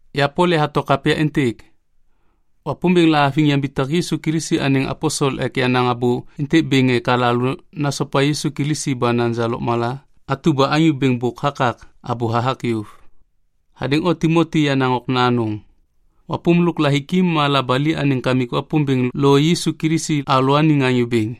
Ya Pol yahato kapya êntêk. Wapômbêŋ lahaviŋ yambitak Yisu Kilisi anêŋ aposel ek yanaŋ abô êntêk bêŋ ek alalô nasopa Yisu Kilisi ba naja lôkmala atu ba Anyô Bêŋ bôk hakak abô hathak yôv. Hadêŋ o Timoti yenaŋ okna anôŋ. Wapôm lôk lahiki ma labali anêŋ Kamik Wapômbêŋ lo Yisu Kilisi alalôaniŋ Anyô Bêŋ.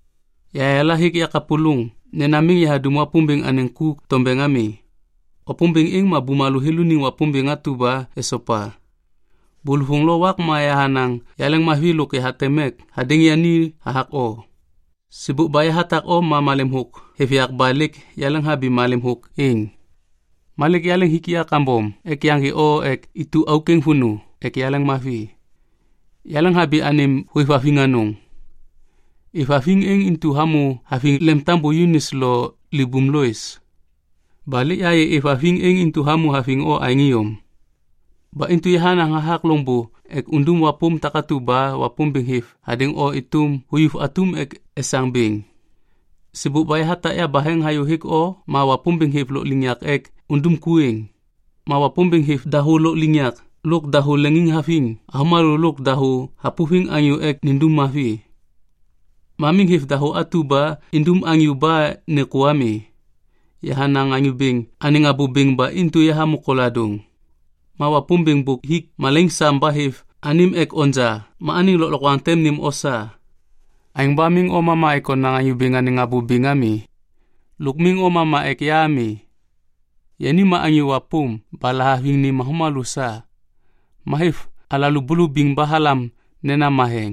Yahayala hêk yakapôlôŋ nena miŋ yahadum Wapômbêŋ anêŋ ku tombeŋ ami. Wapômbêŋ êŋ ma bumalô thêlô iniŋ Wapômbêŋ atu ba esopa. Bôlôvôŋ lo wak ma yahanaŋ yaleŋmavi lôk yahateŋ mek hadêŋ yani hathak o. Sêbôk ba yahatak o ma malem thôk hêv yak ba lêk yaleŋhabi malem thôk êŋ. Ma lêk yaleŋ hik ya kambom ek yaŋgê o ek itu auk êŋ vônô ek yaleŋmavi. Yaleŋhabi anêm hôêvhaviŋ anôŋ. Êvhaviŋ êŋ intu hamô haviŋ lemtambô Yunis lo libum Lois. Ba lêk yahayê êvhaviŋ êŋ intu hamô haviŋ o aêŋ iyom. Ba intu yahanaŋ hathak loŋbô ek undum wapôm takatu ba Wapômbêŋ hêv hadêŋ o êtôm huyuv atum ek esaŋ bêŋ. Sêbôk ba yahatak yabaheŋ hayô hêk o ma Wapômbêŋ hêv lôkliŋyak ek undum ku êŋ. Ma Wapômbêŋ hêv dahô lôkliŋyak lôk dahô leŋiŋhaviŋ avômalô lôk dahô hapôviŋ anyô ek nindum mavi. Ma miŋ hêv dahô atu ba indum anyô ba nêkô ami. Yahanaŋ Anyô Bêŋ anêŋ abô bêŋ ba intu yahamô koladôŋ. Ma Wapômbêŋ bôk hik malaiŋ sam ba hêv anêm ek onja ma anêŋ lôklokwaŋ tem nêm o sa. Aêŋ ba miŋ o mama ek onaŋ Anyô Bêŋ anêŋ abô bêŋ ami. Lôk miŋ o mama ek ya ami. Yani ma anyô wapôm ba lahaviŋ nêm avômalô sa. Ma hêv alalô bulubiŋ ba halam nena matheŋ.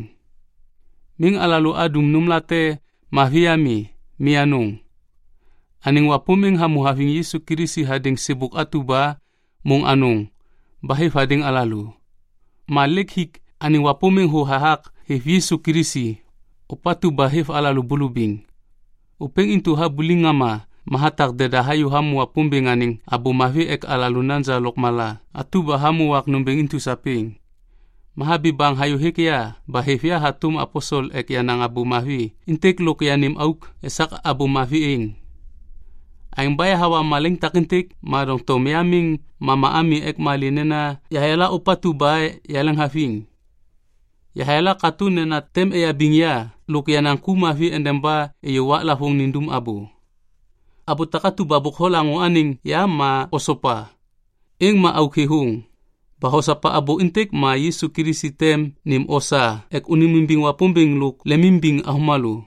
Miŋ alalô adum nômlate mavi ami. Mi anôŋ. Anêŋ wapôm êŋ hamô haviŋ Yisu Kilisi hadêŋ sêbôk atu ba môŋ anôŋ ba hêv hadêŋ alalô. Ma lêk hik anêŋ wapôm êŋ thô hathak hêv Yisu Kilisi, ôpatu ba hêv alalô bulubiŋ. Ôpêŋ intu habuliŋ ŋama ma hatak deda hayô hamô Wapômbêŋ anêŋ Abô Mavi ek alalô naja lôkmala atu ba hamô wak nômbêŋ intu sapêŋ. Ma habi baŋ hayô hêk ya ba hêv ya hatôm aposel ek yanaŋ Abô Mavi êntêk lôk yanêm auk esak Abô Mavi êŋ. Aêŋ ba yahawa malaiŋ takêntêk ma doŋtom ya miŋ mama ami ek malê nena yahayala ôpatu ba yahêvhaviŋ. Yahayala katô nena tem eyabiŋ ya lôk yenaŋ ku mavi endeba êyô waklavôŋ nindum abô. Abô takatu ba bôk holaŋô anêŋ ya ma osopa. Êŋ ma auk thêthôŋ. Ba hosopa abô êntêk ma Yisu Kilisi tem nêm o sa ek ônêmimbiŋ Wapômbêŋ lôk lemimbiŋ avômalô.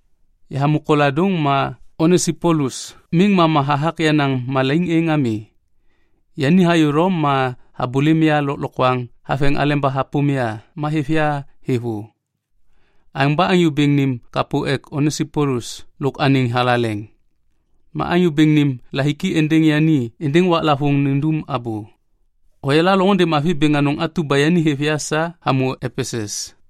Yahamô koladôŋ ma Onesipolus miŋ mama hathak yenaŋ malaiŋ êŋ ami. Yani hayô Lom ma habôlêm ya lôklokwaŋ haveŋ aleba hapôm ya ma hêv ya thêvô. Aêŋ ba Anyô Bêŋ nêm kapô ek Onesipolus lôk anêŋ thalaleŋ. Ma Anyô Bêŋ nêm lahiki êndêŋ yani êndêŋ waklavôŋ nindum abô. Hoyala loŋôndê mavi bêŋ anôŋ atu ba yani hêv ya sa hamô Epesus.